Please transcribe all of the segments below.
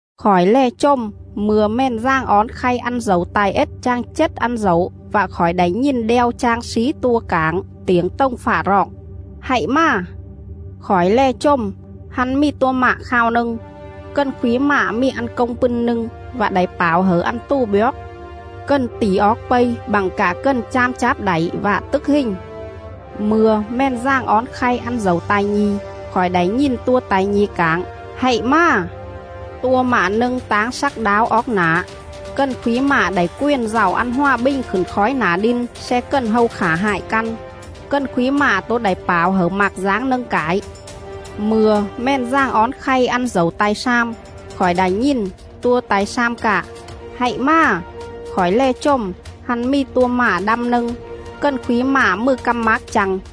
Khỏi lè chồm mư̱a Mèn Dàng Ón khay ăn dẩu ta̱i ết chang chết ăn dẩu vạ khỏi đảy nhìn đeo chang slí tua cảng tiểng tồng fạ roọng: “Hạy mà!” Khỏi lè chồm, hăn mì tua mạ khao nâng. Cần khúy mạ mì ăn công pưn nâng vạ đảy pảo hẩư ăn tù bjoóc. Cần tỉ oóc pây bặng cạ cần cham cháp đảy vạ tức hình.. Mư̱a Mèn Dàng Ón khay ăn dẩu ta̱i nhi̱, khỏi đảy nhìn tua ta̱i nhi̱ cảng: “Hạy mà!” Tua mạ nâng táng slắc đáo oóc nả. Cần khúy mạ đảy quền dạu ăn hòa bình khửn khói nả đin sle cần hâu khả hại căn; cần khúy mạ tố đảy pảo hẩư mạc dáng nâng cải.. Mư̱a Mèn Dàng Ón khay ăn dẩu ta̱i slam, khỏi đảy nhìn tua ta̱i slam cạ: “Hạy mà!” Khỏi lè chồm, hăn mì tua mạ đăm nâng. Cần khúy mạ mừ căm mác chă̱ng..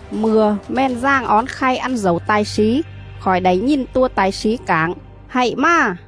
Mư̱a Mèn Dàng Ón khay ăn dẩu ta̱i slí, khỏi đảy nhìn tua ta̱i slí cảng: “Hạy mà!”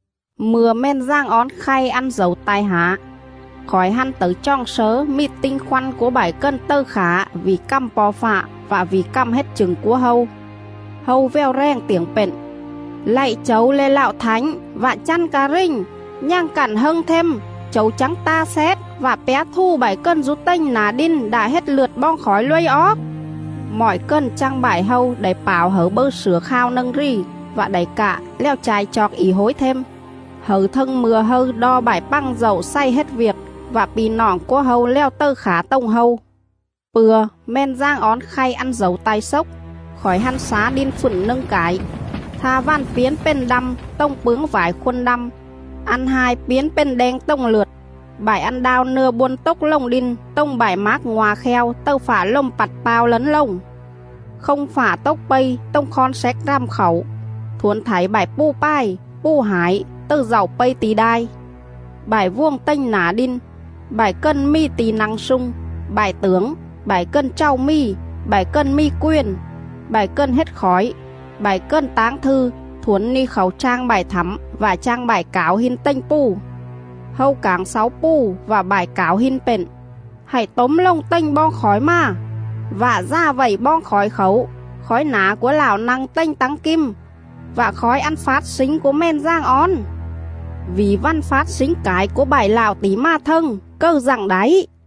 Mư̱a Mèn Dàng Ón khay ăn dẩu ta̱i hả, khỏi hăn tẩư choòng slớ mì tinh khoăn cúa bại cần tầư khả vỉ cằm Po̱ Fạ vạ vỉ cằm hết chửng cúa hâu. Hâu vèo rèng tiểng pện: “Lạy Chẩu le̱ Lạo Thảnh vạ chăn ca rình, nhằng cặn hâng them Chẩu chắng ta xét, vạ pjá thù bại cần dú tềnh nả đin đạ hết lượt boong khỏi luây oóc?” Mọi cần chang bại hâu đảy pảo hẩư bâư slửa khao nâng rì, vạ đảy cạ lèo cha̱i chooc ỉ hối them, hẩư thâng mư̱a hâư đo bại pằng dạu xày hết viêc vạ pi̱ noọng cúa hâu lèo tầư khả tồng hâu. Pư̱a Mèn Dàng Ón khay ăn dẩu ta̱i xốc, khỏi hăn xá đin fựn nâng cải; tha vằn piến pền đăm tồng pướng phải khôn đăm, ăn hai piến pền đeng tồng lượt,. bại ăn đao nưa bôn tốc lồng đin tồng bại mác ngoa̱ kheo tầư fạ lồm pặt pao lấn lồng.. Không fạ tốc pây tồng khon xéc rằm khảu, thuổn thảy bại pù pài, pù hải tầư dạu pây ti̱ đai.. Bại vuồng tềnh nả đin, bại cần mì ti̱ nă̱ng slung, bại tưởng, bại cần chàu mì, bại cần mì quền, bại cần hết khỏi, bại cần táng thư thuổn ni khảu chang bại thẳm vạ chang bại cảo hin tềnh pù.. Hâu cảng xáu pù vạ bại cảo hin pện: “Hạy tốm lồng tềnh boong khỏi mà vạ dà vậy boong khỏi khảu khói nả cúa Lạo nă̱ng tềnh tắng kim vạ khói ăn fát slính cúa Mèn Dàng Ón;. vỉ vằn fát slính cải cúa bại Lạo tỉ mà thâng, cầư dặng đảy?”.